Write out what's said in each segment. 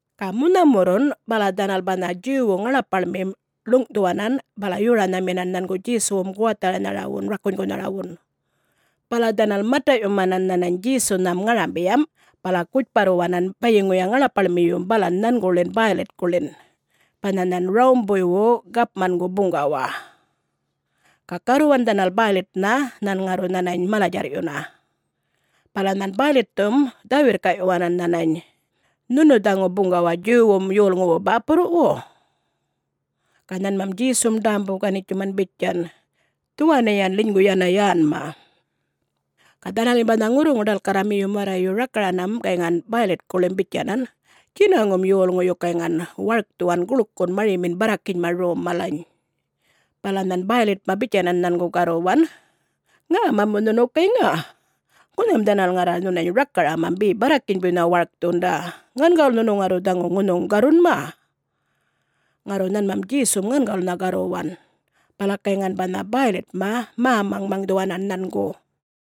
Ga munhamurrun bala dhanal banha Djuwwu ŋaḻapaḻmim ḻuŋ'thuwanan bala yoranhaminan nhangu Djesuwum guwatharanharawum rakunygunharawun. Bala dhanal mata'yumanan nhanany Djesunham ŋarambiyam bala gutjparruwanan bayiŋuya ŋaḻapaḻmiyum balan nhanguḻin Bäylitkuḻin banha nhan Rawumbuywu gapmangu buŋgawa. Ga garruwan dhanal Bäylitnha nhan ŋarru nhanany mala-djarr'yuna. Bala nhan Bäylitthum dhä-wirrkaꞌyuwanan nhanany, “Nhunu dhaŋu buŋgawa Djuwwum yolŋuwu bäpurruwu?” Ga nhanmam Djesum ḏämbu-ganitjuman bitjan, “Dhuwaniyan ḻinygu yana yänma.” Ga dhanalim banha ŋurruŋu-ḏalkarramiyum warrayu rakaranam gayŋan Bäylitkuḻim bitjanan, “Djinaŋum yolŋuyu gayŋan warkthuwan guḻkun marimin barrakinyma rom malany.” Bala nhan Bäylitma bitjanan nhangu garruwan, “Ŋäma mu nhunu gayŋa? Ŋunham dhanal ŋarra nhunany rakaramam be barrakinybuynha warkthunda. Ŋangawulnha nhunu ŋarru dhaŋu ŋunhuŋ garrunma?” Ŋarru nhanmam Djesum ŋangawulnha garruwan, bala gayŋan banha Bäylitma mä-maŋmaŋdhuwanan nhangu.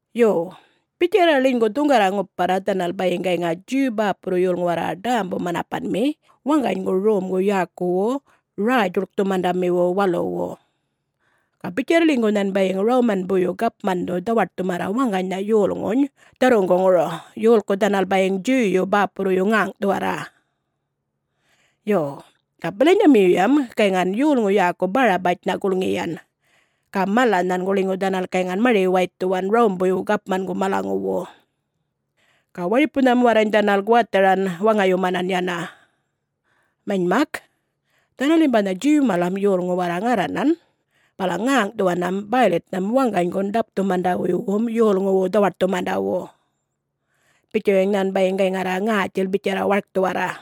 Yo, bitjarra ḻinygu dhuŋgarra-ŋuparra dhanal bayiŋ gayŋa Djuw bäpurru yolŋu warra ḏämbu-manapanmi waŋganygu rom yäkuwu Räy-djuḻkthumandamiwu Waluwu. Ga bitjarra ḻinygu nhan bayiŋ Rawumanbuyyu Gapmandhu dhawaṯthumarra waŋganynha yolŋuny dharruŋguŋuru, yolku dhanal bayiŋ Djuwyu bäpurruyu ŋäŋꞌthuwarra. Yo, ga bilanyamiyuyam gayŋan yolŋu yäku Barabatjnha gulŋiyan ga mala nhangu ḻinygu dhanal gayŋan mari-waythuwan Rawumbuywu gapmangu malaŋuwu. Ga waripunham warrany dhanal guwatharan waŋayumanan yana. Manymak, dhanalim banha Djuw malam yolŋu warra ŋarranan bala ŋäŋꞌthuwanam Bäylitnham waŋganygun ḏapthumandawuywum yolŋuwu dhawaṯthumandawu, bitjuwayiŋ nhan bayiŋ gayŋarra ŋätjil bitjarra warkthuwarra.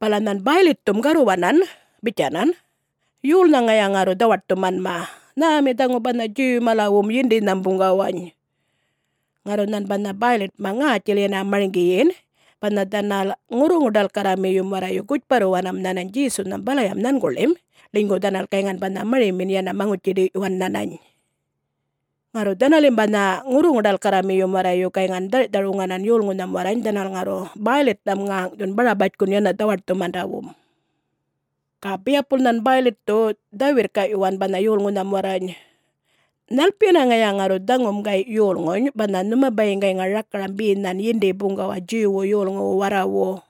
Bala nhan Bäylitthum garruwanan bitjanan, “Yolnha ŋaya ŋarru dhawaṯthumanma? Nhämi dhaŋu banha Djuw-malawum yindinham buŋgawany?”. Ŋarru nhan banha Bäylitma ŋätjil yana marŋgiyin banha dhanal ŋurruŋu-ḏalkarramiyum warrayu gutjparruwanam nhanany Djesunham balayam nhanguḻim, ḻinygu dhanal gayŋan banha marimin yana maŋutji-ḏiyꞌyuwan nhanany. Ŋarru dhanalim banha ŋurruŋu-ḏalkarramiyum warrayu gayŋan dharꞌthar-wuŋanan yolŋunham warrany dhanal ŋarru Bäylitnham ŋäŋꞌthun Barabatjkun yana dhawaṯthundawum. Ga biyapul nhan Bäylitthu dhä-wirrkaꞌyuwan banha yolŋunham warrany, “Nhalpiyana ŋaya ŋarru dhaŋum gayꞌ yolŋuny, banha nhuma bayiŋ gayŋa rakaram be nhan yindi-buŋgawa Djuwwu yolŋuwu warrawu?”.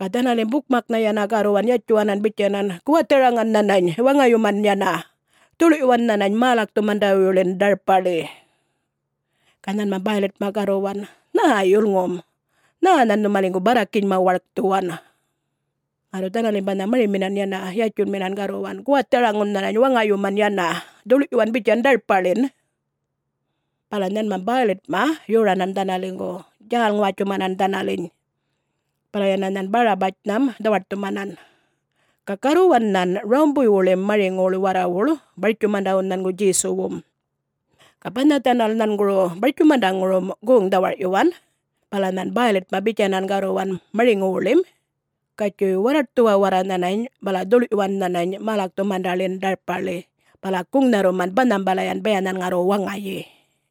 Ga dhanalim bukmaknha yana garruwan yatjuwanan bitjanan, “Guwatharaŋan nhanany waŋayumun yana! Dhuḻ'yuwan nhanany mälakthumandawuyḻin ḏarpaḻi!” Ga nhanmam Bäylitma garruwan, “Nhä yulŋum? Nhä nhan nhumaliŋgu barrakinyma warkthuwan?” Ŋarru dhanalim banha mariminan yana yatjunminan garruwan, “Guwatharaŋun nhanany waŋayumun yana, dhuḻ'yuwan bitjan ḏarpaḻin!” Bala nhanmam Bäylitma yoranan dhanaliŋgu, djäl-ŋuwatjumanan dhanaliny. Bala yana nhan Barabatjnham dhawaṯthumanan. Ga garruwan nhan Rawumbuywuḻim mariŋuwuḻ warrawuḻ bartjumandawun nhangu Djesuwum. Ga banha dhanal nhanguru bartjumandaŋurum goŋ-dhawarꞌyuwan bala nhan Bäylitma bitjanan garruwan mariŋuwuḻim, “Gatjuy warraṯthuwan warra nhanany bala dhuḻꞌyuwan nhanany mälakthundamiḻin ḏarpaḻi bala guŋnharruman banhambalayan, baya nhan ŋarru waŋayi.”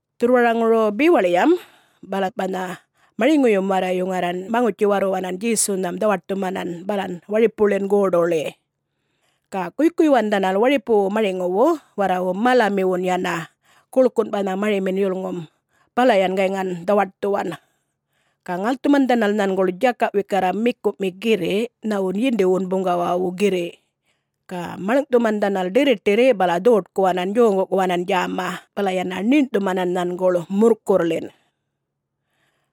Dhurrwaraŋuru bewaḻiyam bala banha mariŋuyum warrayu ŋarran maŋutji-warruwanan Djesunham dhawaṯthumanan balan waripuḻin goḏuḻi. Ga guykuyyuwan dhanal waripuwu mariŋuwu warrawu malamiwun yana, guḻkun banha marimin yulŋum, balayan gayŋan dhawaṯthuwan. Ga ŋalthuman dhanal nhanguḻ djakaꞌ wikarra mikuꞌmi girriꞌ nhawun yindiwun buŋgawawu girriꞌ. Ga maḻŋꞌthuman dhanal ḏirriṯirri bala dhoṯkuwanan, djoŋguꞌkuwanan djäma, bala yana ṉiṉꞌthuman nhanguḻ muḻkurrḻin.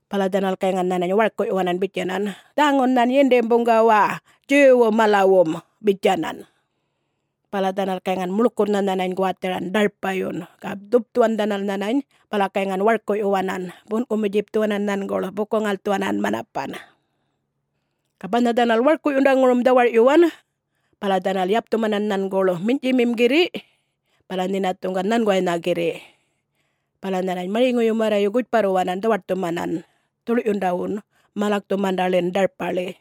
Bala dhanal gayŋan nhanany warkuꞌyuwanan bitjanan, “Dhaŋun nhan yindim buŋgawa, Djuwwu malawum!” bitjanan. Bala dhanal gayŋan muḻkurrnha nhanany guwatharan ḏarpayun, ga dhupthuwan dhanal nhanany bala gayŋan warkuꞌyuwanan, bunꞌkumu-djipthuwanan nhanguḻ buku-ŋalꞌthuwanan manapan. Ga banha dhanal warkuꞌyundaŋurum dhawarꞌyuwan, bala dhanal yapthumanan nhanguḻ minyꞌtjimim girriꞌ bala nhinathuŋgan nhanguwaynha girriꞌ. Bala nhanany mariŋuyum warrayu gutjparruwanan dhawaṯthumanan, dhuḻyundawun mälakthumandaḻin ḏarpaḻi.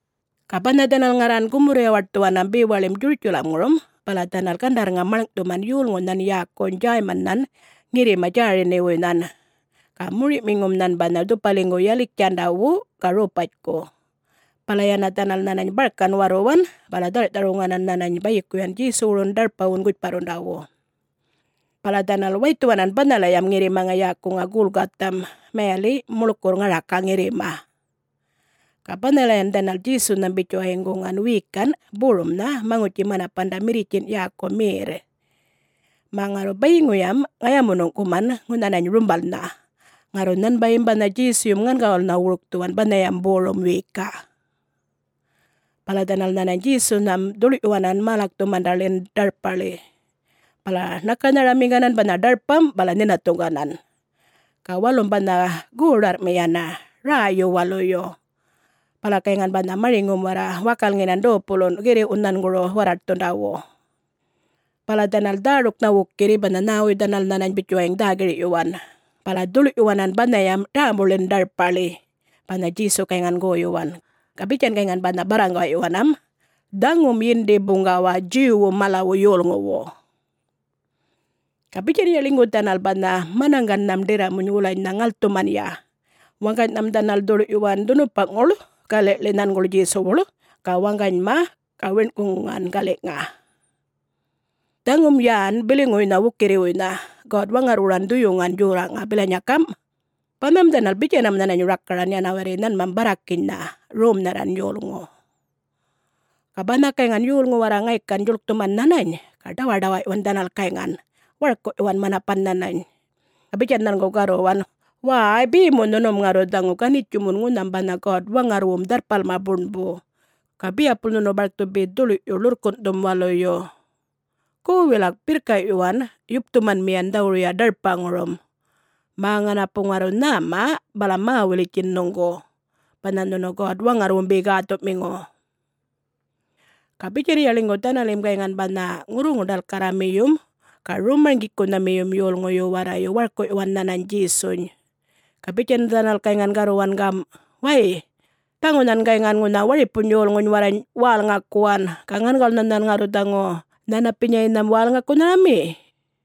Ga banha dhanal ŋarran gumurr-yawaṯthuwanam bewaḻim Djurutjalamŋurum bala dhanal gandarrŋam maḻŋꞌthuman yolŋunhan yäkuny Djäymannhan ŋirrima Djäriniwuynhan. Ga moriꞌmiŋum nhan banha dhupaliŋgu Yaliktjandawu ga Ropatjku. Bala yana dhanal nhanany barkan warruwan bala dharꞌthar-wuŋanan nhanany bayikuyan Djesuwurun ḏarpawun gutjparrundawu. Bala dhanal waythuwanan banhalayam ŋirrimaŋa yäkuŋa Gulgatham, mayaliꞌ, ‘Muḻkurr Ŋaraka Ŋirrima’. Ga banhalayan dhanal Djesunham bitjuwayiŋ guŋan wiyikanꞌ borumnha maŋutji-manapanda mirritjinꞌ yäku merr, mä ŋarru bayiŋuyam ŋayamuṉuŋꞌkuman nhanany rumbalnha. Ŋarru nhanbayim banha Djesuyum ŋangawulnha wurkthuwan banhayam borum wiyikaꞌ. Bala dhanal nhanany Djesunham dhuḻꞌyuwanan mälakthumandaḻin ḏarpaḻi. Bala ṉakanharamiŋganan banha ḏarpam, bala nhinathuŋganan. Ga walum banha goḏarrꞌmi yana, räyyu-waluyu. Bala gayŋan banha mariŋum warra wakalŋinan dopulunꞌ girriꞌwun nhanguru warraṯthundawu. Bala dhanal dhäruknha wukirri banha nhäwuy dhanal nhanany bitjuwayiŋ dhä-girꞌyuwan, bala dhuḻꞌyuwanan banhayam ḏämbuḻin ḏarpaḻi, banha Djesu gayŋan goyuwan. Ga bitjan gayŋan banha barraŋgaꞌyuwanam, “Dhaŋun Yindim Buŋgawa Djuwwum malawu yolŋuwu” Ga bitjanya ḻinygu dhanal banha manaŋgannham ḏirramuny wulanynha ŋalthumanya, waŋganynham dhanal dhuḻꞌyuwan dhunupaꞌŋuḻ galiḻi nhanguḻ Djesuwuḻ, ga waŋganyma ga wiṉꞌkuŋuŋan galiꞌŋa. [Dhaŋum yän biliŋuwuynha wukirriwuynha God-Waŋarrwuran Dhuyuŋan Djorraꞌŋa bilanya gamꞌ, “Banham dhanal bitjanam nhanany rakaran, yana warri nhanmam barrakinynha, romnharran yolŋu.”] Ga banha gayŋan yolŋu warra ŋaykan djuḻkthuman nhanany, ga ḏawaḏawaꞌyuwan dhanal gayŋan, warkuꞌyuwan manapan nhanany. Ga bitjan nhangu garruwan, “Wäy, be mu nhunum ŋarru dhaŋu ganitjumun ŋunham banha God-Waŋarrwum Dharrpalma Buṉbu, ga biyapul nhunu barkthu be dhuḻꞌyu ḻurrkunꞌthum waluyu? Gu, wilak birrkaꞌyuwan yupthumanmiyan dhawuruya ḏarpaŋurum, mä ŋanapu ŋarru nhäma bala mä-wulitjin nhuŋgu, banha nhunu God-Waŋarrwum be gäthuꞌmiŋu?” Ga bitjanya ḻinygu dhanalim gayŋan banha ŋurruŋu-ḏalkarramiyum ga rom-marŋgikunhamiyum yolŋuyu warrayu warkuꞌyuwan nhanany Djesuny. Ga bitjan dhanal gayŋan garruwan gamꞌ, “Way, dhaŋu nhan gayŋan ŋunha waripuny yolŋuny warrany wälŋakuwan... ga ŋangawulnha nhan ŋarru dhaŋu nhanapinyaynham wälŋakunharami?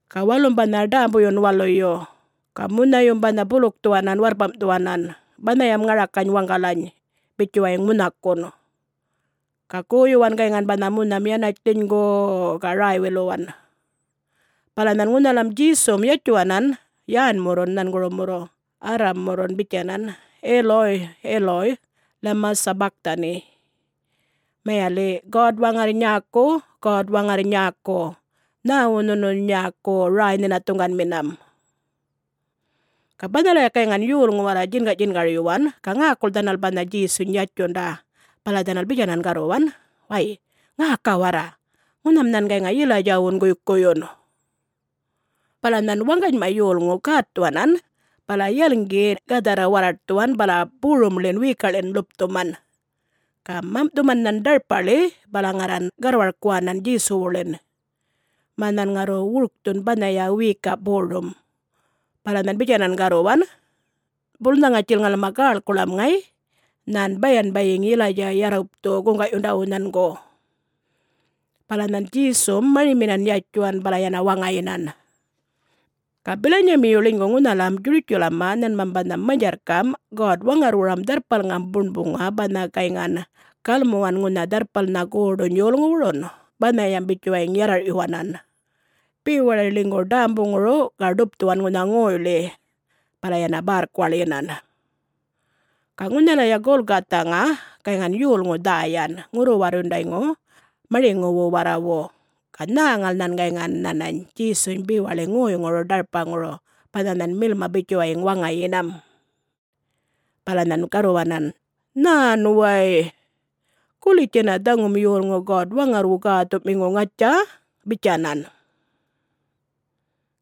Ga walum banha ḏämbuyun waluyu, ga munhayum banha bulukthuwanan warrpamꞌthuwanan banhayam ŋarakany waŋgalany, bitjuwayiŋ munhakun. Ga goyuwan gayŋan banha munham yanatj ḻinygu-u-u ga räy-wiluwan. Bala nhan ŋunhalam Djesum yatjuwanan yänmurrun nhangurumurru Aram-murrun bitjanan, “Eloi, Eloi, lema sabachthani?” (mayaliꞌ, “God-Waŋarr nyäku, God-Waŋarr nyäku, nhäwu nhunu nyäku räy-nhinathuŋganminam?”) Ga banhalaya gayŋan yolŋu warra djingaꞌdjingaryuwan, ga ŋäkul dhanal banha Djesuny yatjunda. Bala dhanal bitjanan garruwan, “Way ŋäka warra! Ŋunham nhan gayŋa Yilaydjawun guykuyyun.” Bala nhan waŋganyma yolŋu gätthuwanan bala yalŋgi gadharra warraṯthuwan bala borumḻin wiyikaꞌḻin ḻupthuman. Ga mamꞌthuman nhan ḏarpaḻi bala ŋarran garrwarkuwanan Djesuwuḻin, mä nhan ŋarru wurkthun banhaya wiyikaꞌ borum. Bala nhan bitjanan garruwan, “Bulnha ŋatjil ŋalma gäḻkuḻam ŋay, nhan bayan bayiŋ Yilaydja yarrupthu guŋgaꞌyundawu nhangu.” Bala nhan Djesum mariminan yatjuwan, bala yana waŋayinan. Ga bilanyamiyu ḻinygu ŋunhalam Djurutjalamma nhanmam banha manydjarrkamꞌ God-Waŋarrwuram Dharrpalŋam Buṉbuŋa banha gayŋan galmuwan ŋunha dharrpalnhan goḏuny yolŋuwurun, banhayam bitjuwayiŋ yarrarꞌyuwanan, bewaḻi ḻinygu ḏämbuŋuru ga ḏupthuwan ŋunha ŋoyḻi, bala yana bärrkuwaḻyinan. Ga ŋunhalaya Gulgathaŋa gayŋan yolŋu dhäyan, ŋurru-warrundayŋu mariŋuwu warrawu, ga nhäŋal nhan gayŋan nhanany Djesuny bewaḻi ŋoyŋuru ḏarpaŋuru banha nhan milma bitjuwayiŋ waŋayinam. Bala nhan garruwanan, “Nhän way! Gulitj yana dhaŋum yolŋu God-Waŋarrwu Gäthuꞌmiŋu, ŋatja?” bitjanan.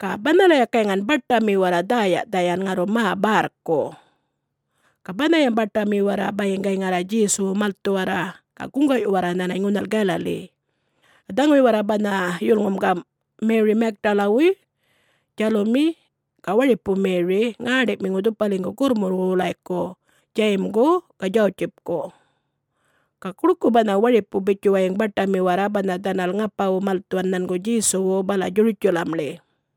Ga banhalaya gayŋan baṯami warra dhäya-dhayan, ŋarru mä bärrku. Ga banhayam baṯami warra bayiŋ gayŋarra Djesuwu malthuwarra, ga guŋgaꞌyuwarra nhanany ŋunhal Galali. Ga dhaŋuy warra banha yulŋum gamꞌ: Meri Magdalawuy, Djalumi, ga waripu Meri, ŋäṉḏiꞌmiŋu dhupaliŋgu gurrmulwu wulayku Djayimgu ga Djawutjipku, ga guḻku banha waripu bitjuwayiŋ baṯami warra banha dhanal ŋapawu malthuwan nhangu Djesuwu bala Djurutjalamḻi.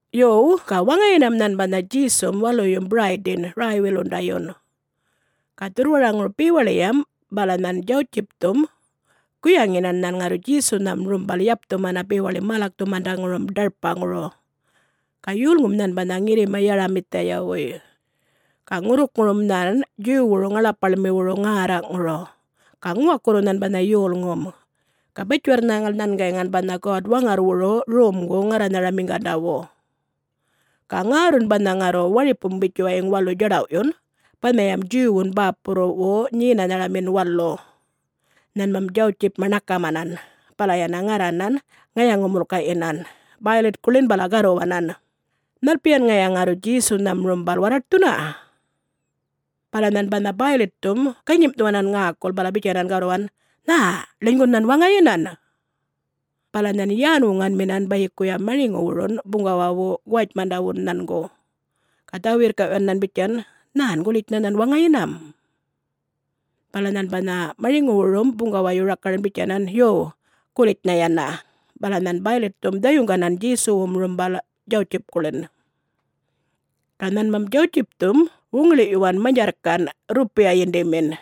Yo, ga waŋayinam nhan banha Djesum waluyum Biraydin räy-wilundayun. Ga dhurrwaraŋuru bewaḻiyam bala nhan Djawutjipthum guyaŋinan nhan ŋarru Djesunham rumbal yapthumana bewaḻi mälakthumandaŋurum ḏarpaŋuru. Ga yolŋum nhan banha ŋirrima Yaramithiyawuy, ga ŋurrukŋurum nhan Djuwwuru ŋaḻapaḻmiwuru ŋärraꞌŋuru. Ga ŋuwakurru nhan banha yolŋum. Ga batjiwarr-nhäŋal nhan gayŋan banha God-Waŋarrwuru romgu-ŋarranharamiŋgandawun. Ga ŋärrun banha ŋarru waripum bitjuwayiŋ walu djaḏawꞌyun banhayam Djuwwun bäpurruwu Nyenanharamin Walu, nhanmam Djawtjipma ṉakaman, bala yana ŋarranan ŋayaŋu-mulkaꞌyinan Bäylitkuḻin bala garruwanan, “Nhalpiyan ŋaya ŋarru Djesunham rumbal warraṯthuna?” Bala nhan banha Bäylitthum ganyimꞌthuwanan ŋäkul, bala bitjanan garruwan, “Nhä, ḻinygun nhan waŋayinan?” Bala nhan yän-wuŋanminan bayikuya mariŋuwurun buŋgawawu guwatjmandawu nhangu, ga dhä-wirrkaꞌyuwan nhan bitjan, “Nhän, gulitjnha nhan waŋayinam?” Bala nhan banha mariŋuwurum buŋgawayu rakaran bitjanan, “Yuw, gulitjnha yana!” Bala nhan Bäylitthum dhayuŋganan Djesuwum rumbal Djawutjipkuḻin. Ga nhanmam Djawutjipthum wuŋiḻiꞌyuwan manydjarrkanꞌ rrupiya yindimin,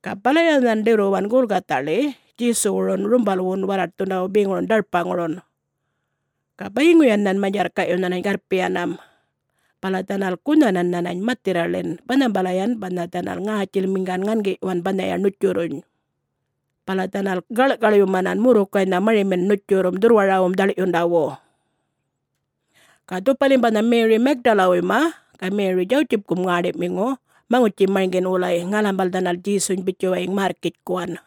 ga balaya nhan ḏirruwan Gulgathaḻi Djesuwun rumbalwun warraṯthundawu beŋurun ḏarpaŋurun. Ga bayiŋuyan nhan manydjarrkaꞌyu nhanany garrpiyanam, bala dhanal gunhanan nhanany mathirraḻin, banhambalayan banha dhanal ŋätjilmiŋgan ŋangiꞌyuwan banhaya ṉutjurruny. Bala dhanal gaḻꞌkaḻumanan murrukaynha marimin ṉutjurrum, dhurrwarawum dhaḻꞌyundawu. Ga dhupalim banha Meri Magdalawuyma ga Meri Djawutjipkum ŋäṉḏiꞌmiŋu maŋutji-marŋgin wulay ŋalambal dhanal Djesuny bitjuwayiŋ märrkitjkuwan.